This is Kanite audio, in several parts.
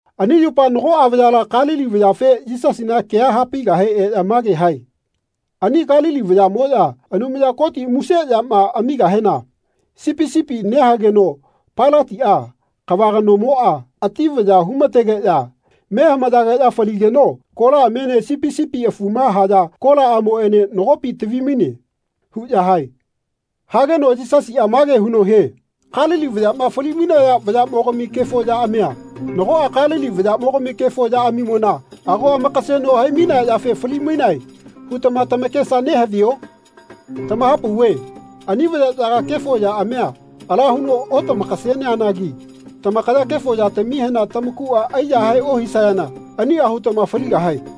Ani yupa nagoꞌa vayala Kalili vayafe Yisasina kea hapaigahe eꞌya mage hae “Ani Kalili vayaꞌmoꞌya Anumaya Koti muse yama amigahena sipi sipi nehageno Pailatiꞌa, kava kanomoꞌa, ati vaya humategeꞌya me hamayageꞌya faligeno kolaꞌamiene sipi sipi afuma haya kolaꞌamoꞌene nagopi tavi-maine.” huꞌya hae. Hageno Yisasiꞌa mage huno hie “Kalili vayaꞌma fali-mainaya vayaꞌmogami kefo yaꞌamia nagoꞌa Kalili vayaꞌmogami kefo yaꞌamimona ago amakaseno hai-mainea yafe fali-mainae hutama tamakesa nehavio? Tamahapauve ani vayaꞌyaga kefo yaꞌamia ala huno otamakaseneanagi tamakaya kefo yatamihena tamakuꞌa aiyahae ohisayana aniꞌa hutama faligahae.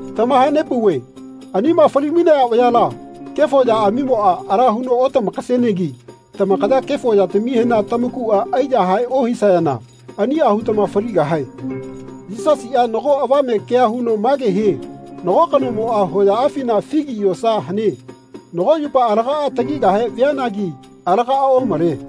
Tamahanepauve anima fali-mainaya vayala kefo yaꞌamimoꞌa ala huno otamakasenegi tamakaya kefo yatamihena tamakuꞌa aiyahae ohisayana aniꞌa hutama faligahae.” Yisasiꞌa nago avame kea huno mage hie “Nago kanomoꞌa hoyaꞌafina figi yosa hane. Nago yupa alagaꞌa tagigahe vianagi alagaꞌa omale.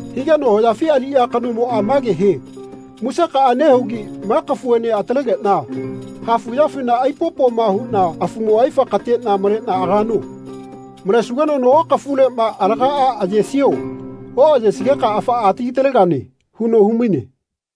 Higeno hoyafi aliꞌya kanomoꞌa mage hie ‘Musekaꞌa nehugi ma kafuene atalegeꞌna hafuꞌyafina aipopoꞌma huꞌna afumo aifa kateꞌna maleꞌna agano. Malesugeno nago kafuleꞌma alagaꞌa ayesio? Oꞌayesigeka afaꞌa atagi-talegane.’ huno humaine.”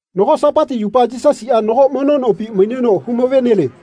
Nago Sapati yupa Yisasiꞌa nago mono nopi maineno humavenelie.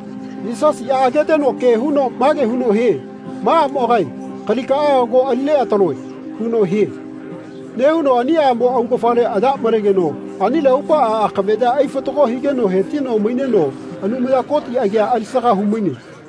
Yisasiꞌa ageteno ke huno mage huno hie “Ma aꞌmogae kalikaꞌa ago ali neꞌataloe.” huno hie. Nehuno ani aꞌmo augafale aya malegeno anile aupaꞌa akaveꞌya aifatago higeno hetino maineno Anumaya Koti agia alisaga humaine.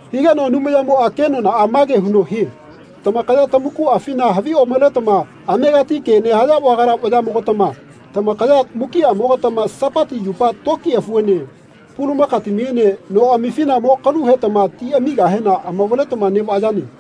Higeno Anumayamoꞌa kenonaꞌa mage huno hie “Tamakaya tamakuꞌafina havi omaletama amegati ke nehaya vagala vayaꞌmogatama tamakaya mukiꞌamogatama Sapati yupa toki afuene pulamakatamiene noꞌamifina mo kalu hetama ti amigahena amavaletama neꞌvayane.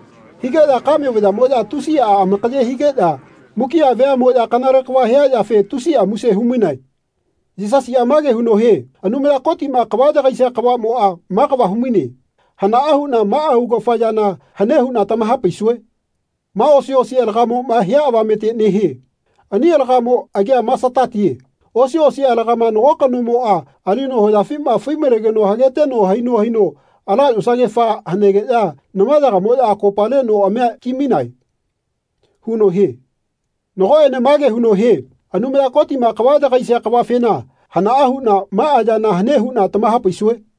Higeꞌya kame vayaꞌamoꞌya tusiꞌa amakaye higeꞌya mukiꞌa veaꞌmoꞌya kanale kava hia yafe tusiꞌa muse humainae. Yisasiꞌa mage huno hie “Anumaya Kotiꞌma kava yagaisia kavaꞌmoꞌa ma kava humaine? Hanaꞌa huꞌna maꞌa augafa yana hane huꞌna tamahapaisue? Ma osi osi alagamoꞌma hia avamete nehie. Ani alagamo agia masatatie. Osi osi alagama nago kanomoꞌa alino hoyafima fai-malegeno hageteno haino haino ala yosagefa hanegeꞌya namayagamoꞌya akopale noꞌamia ki-mainae.” huno hie. Nagoꞌene mage huno hie “Anumaya Kotiꞌma kava yagaisia kavafena hanaꞌa huꞌna maꞌa yana hane huꞌna tamahapaisue?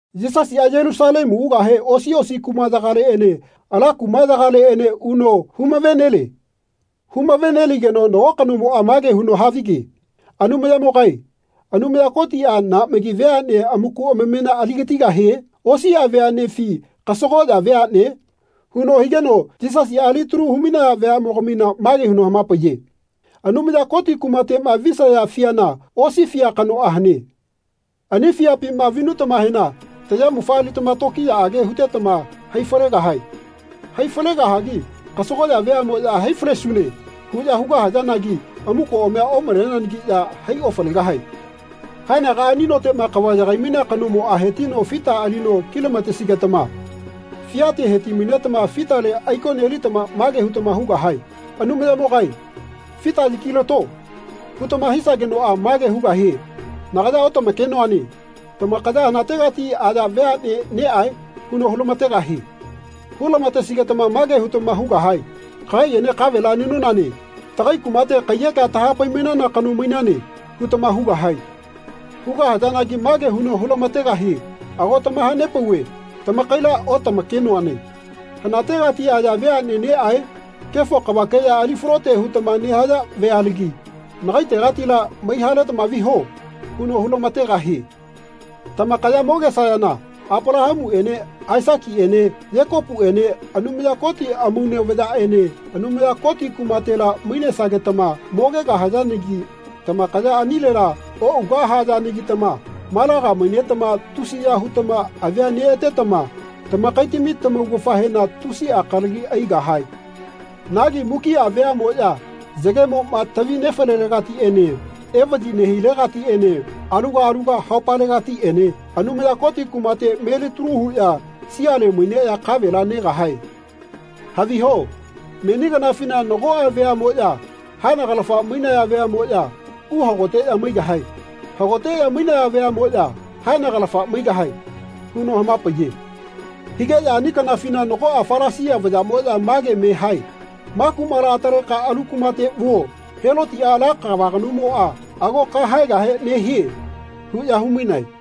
Yisasiꞌa Yelusalemu ugahe osiꞌosi kumaꞌyagaleꞌene ala kumaꞌyagaleꞌene uno humavelie. Humaveneligeno nago kanomoꞌa mage huno havige “Anumayamogae Anumaya Kotiꞌa naꞌmagi veaꞌne amaku amamena aligatigahie? Osiꞌa veaꞌnefi kasagoꞌya veaꞌne?” huno higeno Yisasiꞌa alitalu humainaya veaꞌmogamina mage huno hamapaiye “Anumaya Koti kumateꞌma visaya fiana osi fia kanoꞌa hane. Ani fiapima vinutamahena tamayamufa alitama tokiyaꞌage hutetama hai falegahae. Hai falegahagi kasagoꞌya veaꞌmoꞌya ‘Hai falesune.’ huꞌya hugahayanagi amukoꞌamia omaleneanagiꞌya hai ofalegahae. Haenagaꞌa ani noteꞌma kava yagai-mainea kanomoꞌa hetino fita alino kilamatesigetama fiate heti-mainetama fitale aiko nelitama mage hutama hugahae ‘Anumayamogae fita yakilato.’ hutama hisagenoꞌa mage hugahie ‘Nagaya otamakenoane. Tamakaya hanategati aya veaꞌne neꞌae?’ huno hulamategahie. Hulamatesigetama mage hutama hugahae ‘Kagaiꞌene kavela nenonane. Tagai kumate kaiyekea tahapai-mainana kano mainane.’ hutama hugahae. Hugahayanagi mage huno hulamategahie ‘Ago tamahanepauve tamakaila otamakenoane. Hanategati aya veaꞌne neꞌae? Kefo kavakeꞌya ali falote hutama nehaya vealagi nagaitegatila mai-haletama viho.’ huno hulamategahie. Tamakaya mogesayana Apalahamuꞌene Aisakiꞌene Yekopuꞌene Anumaya Koti amaune vayaꞌene Anumaya Koti kumatela mainesagetama mogegahayanagi tamakaya anilela oꞌugahayanagitama malaga mainetama tusiya hutama avia neꞌatetama tamakaitami tamaugafahena tusiꞌa kalagi aigahae. Nagi mukiꞌa veaꞌmoꞌya yagemoꞌma tavi nefalelegatiꞌene evaꞌyi nehilegatiꞌene aluga aluga haupalegatiꞌene Anumaya Koti kumate melitalu huꞌya siale maineꞌya kavela negahae. Haviho meni kanafina nagoꞌa veaꞌmoꞌya haenagalafa mainaya veaꞌmoꞌya uhagoteꞌya maigahae. Hagoteꞌya mainaya veaꞌmoꞌya haenagalafa maigahae.” huno hamapaiye. Higeꞌya ani kanafina nagoꞌa Falasia vayaꞌmoꞌya mage me hae “Ma kumala ataleka alu kumate vuo. Helotiꞌa ala kava kanomoꞌa ago kahaegahe nehie.” huꞌya humainae.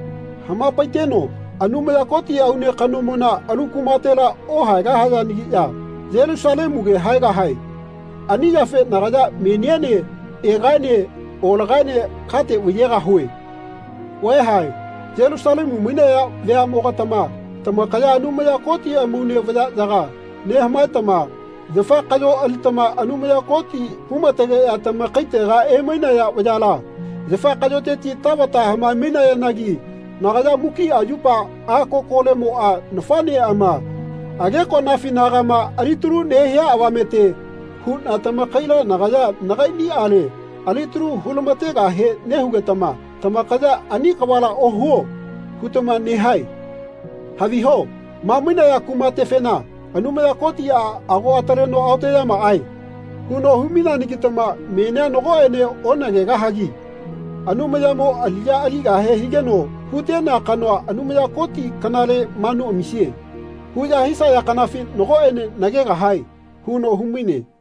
Hamapaiteno “Anumaya Koti aune kanomona alu kumatela ohaegahayanagiꞌya Yelusalemuge haegahae. Ani yafe nagaya meniene egaene olagaene kate vaiyegahue. Vaeha Yelusalemu mainaya veaꞌmogatama tamakaya Anumaya Koti amaune vayaꞌyaga nehamaetama yafa kaꞌyo alitama Anumaya Koti humategeꞌya tamakaitega emainaya vayala yafa kaꞌyoteti tavata hamae-mainayanagi nagaya mukiꞌa yupa a kokolemoꞌa nafaꞌneꞌama agekoꞌnafinagama alitalu nehia avamete huꞌna tamakaila nagaya nagaiꞌniꞌale alitalu hulamategahe nehugetama tamakaya ‘Ani kavala ohuo.’ hutama nehae. Haviho ma mainaya kumatefena Anumaya Kotiꞌa ago ataleno ‘Aoteꞌyamaꞌae.’ huno humaineanagitama menia nagoꞌene onagegahagi ‘Anumayamo aliꞌya aligahe higeno hutenea kanoa Anumaya Koti kanale manu amisie.’ huꞌya hisaya kanafi nagoꞌene nagegahae.” huno humaine.